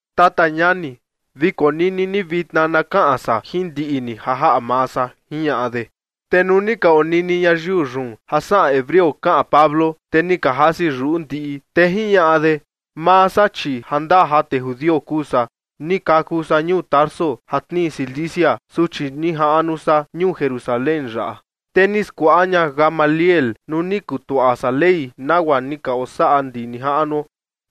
―Tata ñani, vi konini ni vitna na kaꞌan san jin ndiꞌi ni ja jaꞌa maa san ―jiñaꞌa de. Te nuu ni ka onini ñayiu yun ja saꞌan hebreo kaꞌan Pablo, te ni ka jasi yuꞌu ndiꞌi, te jiñaꞌa de: ―Maa san, chi jandaa ja tee judio kuu san. Ni kaku san ñuu Tarso ja tnii Cilicia, su chi ni jaꞌnu san ñuu Jerusalén yaꞌa. Te ni skuaꞌa ña Gamaliel nuu ni kutuaꞌa san Ley nagua ni ka osaꞌa ndi nijaꞌnuo.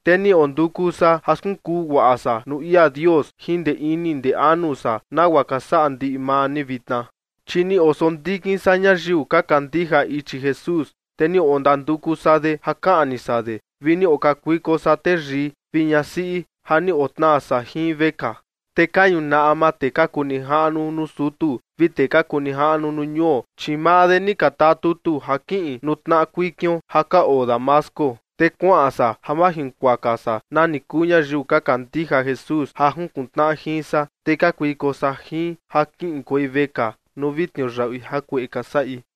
Te ni onduku san ja skunkuu guaꞌa san nuu ia Dios jin ndee ini ndee anu san nagua ka saꞌa ndiꞌi maa ni vitna. Chi ni osondikin san ñayiu ka kandija ichi Jesús, te ni ondanduku san de ja kaꞌni san de vi ni okakuiko san teyii vi ñasiꞌi ja ni otnaa san jin vekaa. Te ka ñunaꞌa maa tee ka kuu nijaꞌnu nuu sutu vi tee ka kuu nijaꞌnu nuu ñuo, chi maa de ni ka taa tutu ja kiꞌin nuu tnaꞌa kuikion ja ka oo Damasco, te kuaꞌan san ja majinkuaka san nani kuu ñayiu ka kandija Jesús ja junkuntnaꞌa jin san, te kakuiko san jin ja kiꞌinkuei vekaa nuu vi tniuyaꞌui jakueꞌe ka saꞌi.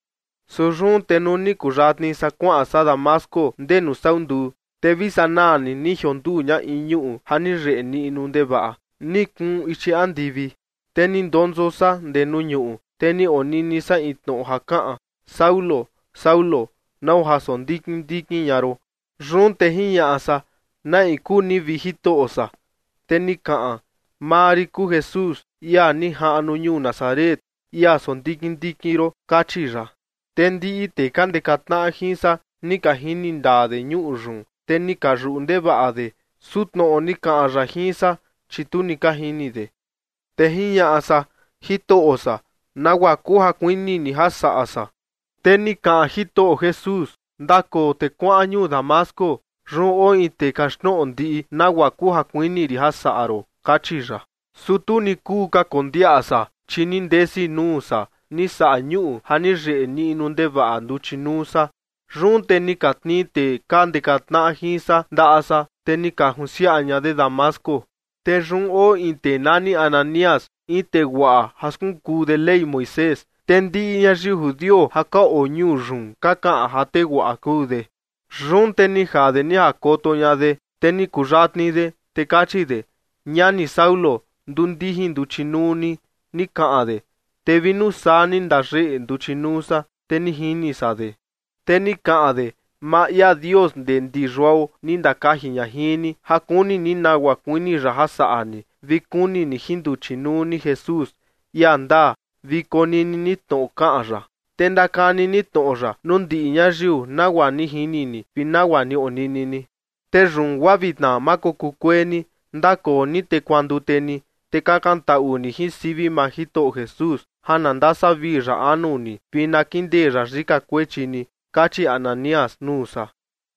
’Su yun te nuu ni kuyatni san kuaꞌan san Damasco ndee nuu sau nduu, te vi sanaa ni ni jionduu ña in ñuꞌu ja ni yeꞌe niꞌnu ndevaꞌa, ni kuun ichi andivi. Te ni ndonso san ndee nuu ñuꞌu, te ni onini san in tnoꞌo ja kaꞌan: “Saulo, Saulo, ¿nau ja sondikin ndikin ña ron?” Yun te jiñaꞌa san: “¿Na in kuu ni, vi Jitoꞌo san?” Te ni kaꞌan: “Maa rin kuu Jesús, ia ni jaꞌnu ñuu Nazaret, ia sondikin ndikin ron”, kachi ya. Te ndiꞌi tee ka ndeka tnaꞌa jin san ni ka jini ndaa de ñuꞌu yun, te ni ka yuꞌu ndevaꞌa de, su tnoꞌo ni kaꞌan ya jin san, chi tu ni ka jini de. Te jiñaꞌa san: “Jitoꞌo san, ¿nagua kuu ja kuini ni ja saꞌa san?” Te ni kaꞌan Jitoꞌo Jesús: “Ndakoo te kuaꞌan ñuu Damasco. Yun oo in tee kaxtnoꞌo ndiꞌi nagua kuu ja kuini rin ja saꞌa ron”, kachi ya. Su tu ni kuu ka kondiaꞌa san, chi ni ndesi nuu san ni saꞌa ñuꞌu ja ni yeꞌe niꞌnu ndevaꞌa nduchi nuu san. Yun te ni ka tnii tee ka ndeka tnaꞌa jin san ndaꞌa san, te ni ka junsiaꞌa ña de Damasco. ’Te yun oo in tee nani Ananías, in tee guaꞌa ja skunkuu de Ley Moisés. Te ndiꞌi ñayiu judio ja ka oo ñuu yun ka kaꞌan ja tee guaꞌa kuu de. Yun te ni jaa de ni jakoto ña de, te ni kuyatni de, te kachi de: “Ñani Saulo, nduu ndijin nduchi nuu ni”, ni kaꞌan de. Te vi nuu saa ni ndayeꞌe nduchi nuu san, te ni jini san de. Te ni kaꞌan de: “Maa ia Dios ndee ndi yuao ni ndakaji ña jin ni, ja kuni ni nagua kuini ya ja saꞌa ni, vi kuni ni jin nduchi nuu ni Jesús, ia ndaa, vi konini ni tnoꞌo kaꞌan ya. Te ndakani ni tnoꞌo ya nuu ndiꞌi ñayiu nagua ni jini ni vi nagua ni onini ni. Te yun guaa vitna ma kokuu kuee ni. Ndakoo ni te kuandute ni, te kakantaꞌu ni jin sivi maa Jitoꞌo Jesús ja na ndasavii ya anu ni vi na kindee ya yika kuechi ni” kachi Ananías nuu san.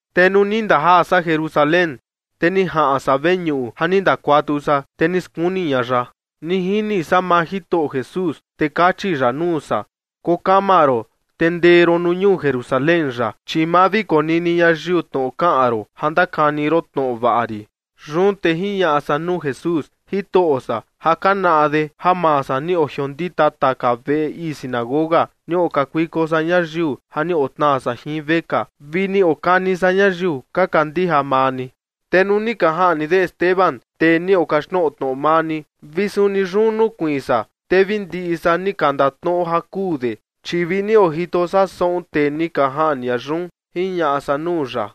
’Te nuu ni ndajaa san Jerusalén, te ni jaꞌan san veñuꞌu ja ni ndakuatu san, te ni skuni ña ya. Ni jini san maa Jitoꞌo Jesús, te kachi ya nuu san: “Koo kama ron, te ndee ron nuu ñuu Jerusalén yaꞌa, chi ma vi konini ñayiu tnoꞌo kaꞌan ron ja ndakani ron tnoꞌo vaꞌa rin”. Yun te jiñaꞌa san nuu Jesús: “Jitoꞌo san, ja ka naꞌa de ja maa san ni ojiondita taka veꞌe ii sinagoga, ni okakuiko san ñayiu ja ni otnaa san jin vekaa, vi ni okani san ñayiu ka kandija maa ni. Te nuu ni ka jaꞌni de Esteban, tee ni okaxtnoꞌo tnoꞌo maa ni, vi suni yun nukuiin san, te vi ndiꞌi san ni ka ndatnoꞌo ja kuu de, chi vi ni ojito san saꞌun tee ni ka jaꞌni ña yun” jiñaꞌa san nuu ya.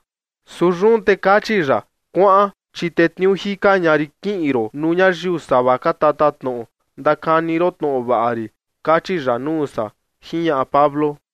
Su yun te kachi ya: “Kuaꞌan, chi tetniuu jika ña rin kiꞌin ron nuu ñayiu sava ka tatatnoꞌo, ndakani ron tnoꞌo vaꞌa rin”, kachi ya nuu san ―jiñaꞌa Pablo.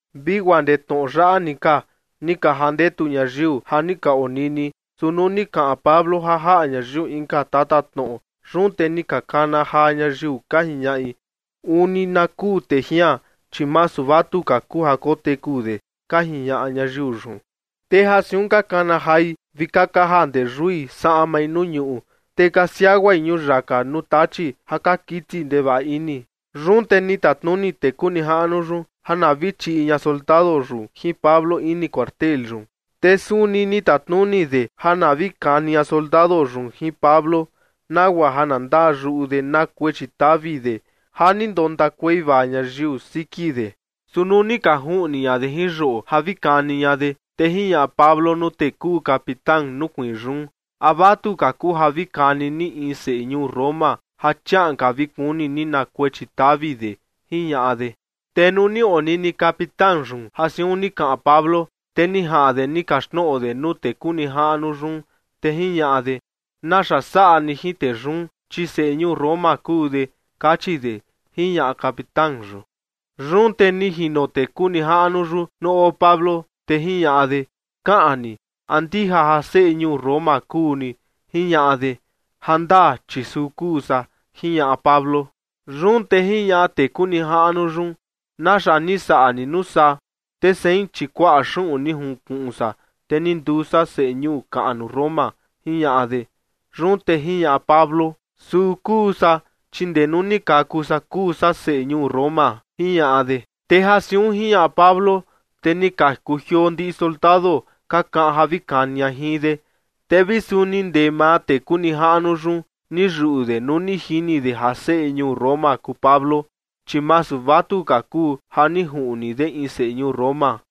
Vi guaa ndee tnoꞌo yaꞌa ni ka, ni ka jandetu ñayiu ja ni ka onini. Su nuu ni kaꞌan Pablo ja jaꞌa ñayiu inka tatatnoꞌo, yun te ni ka kana jaa ñayiu, ka jiñaꞌi: ―Uni na kuu tee jian, chi masu vatuka kuu ja koteku de ―ka jiñaꞌa ñayiu yun. Te ja siun ka kana jai vi ka kaja ndee yui saꞌmai nuu ñuꞌu, te ka siaguai ñuyaka nuu tachi ja ka kiti ndevaꞌa ini. Yun te ni tatnuni tee kuu nijaꞌnu yun ja na vi chiꞌi ña soldado yun jin Pablo ini cuartel yun. Te suni ni tatnuni de ja na vi kani ña soldado yun jin Pablo, nagua ja na ndaa yuꞌu de na kuechi tavi de ja ni ndontakuei vaa ñayiu siki de. Su nuu ni ka juꞌni ña de jin yoꞌo ja vi kani ña de, te jiñaꞌa Pablo nuu tee kuu capitán nukuiin yun: ―¿A vatuka kuu ja vi kani ni in seꞌe ñuu Roma ja chiaꞌan ka vi kuni ni na kuechi tavi de? ―jiñaꞌa de. Te nuu ni onini capitán yun ja siun ni kaꞌan Pablo, te ni jaꞌan de ni kaxtnoꞌo de nuu tee kuu nijaꞌnu yun, te jiñaꞌa de: ―¿Naxa saꞌa ni jin tee yun? Chi seꞌe ñuu Roma kuu de, kachi de ―jiñaꞌa capitán yun. Yun te ni jino tee kuu nijaꞌnu yun nuu oo Pablo, te jiñaꞌa de: ―Kaꞌan ni, ¿a ndija ja seꞌe ñuu Roma kuu ni? ―jiñaꞌa de. ―Jandaa, chi suu kuu san ―jiñaꞌa Pablo. Yun te jiñaꞌa tee kuu nijaꞌnu yun: ―¿Naxa ni saꞌa ni nuu saa? Te sein, chi kuaꞌa xuꞌun ni junkuꞌun san, te ni nduu san seꞌe ñuu kaꞌnu Roma ―jiñaꞌa de. Yun te jiñaꞌa Pablo: ―Suu kuu san, chi ndee nuu ni kaku san kuu san seꞌe ñuu Roma ―jiñaꞌa de. Te ja siun jiñaꞌa Pablo, te ni ka kujioo ndiꞌi soldado ka kaꞌan ja vi kani ña jin de. Te vi suni ndee maa tee kuu nijaꞌnu yun, ni yuꞌu de nuu ni jini de ja seꞌe ñuu Roma kuu Pablo, chi masu vatuka kuu ja ni juꞌni de in seꞌe ñuu Roma.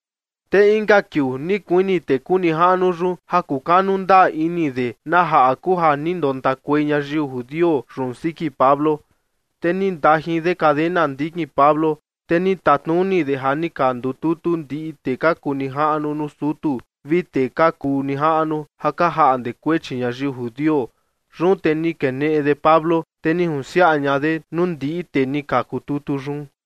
Te inka kiuu ni kuini tee kuu nijaꞌnu yun ja kukanu ndaa ini de na jaꞌa kuu ja ni ndontakuei ñayiu judio yun siki Pablo, te ni ndajin de cadena ndikin Pablo. Te ni tatnuni de ja ni ka ndututu ndiꞌi tee ka kuu nijaꞌnu nuu sutu vi tee ka kuu nijaꞌnu ja ka jaꞌnde kuechi ñayiu judio. Yun te ni keneꞌe de Pablo, te ni junsiaꞌa ña de nuu ndiꞌi tee ni ka ndututu yun.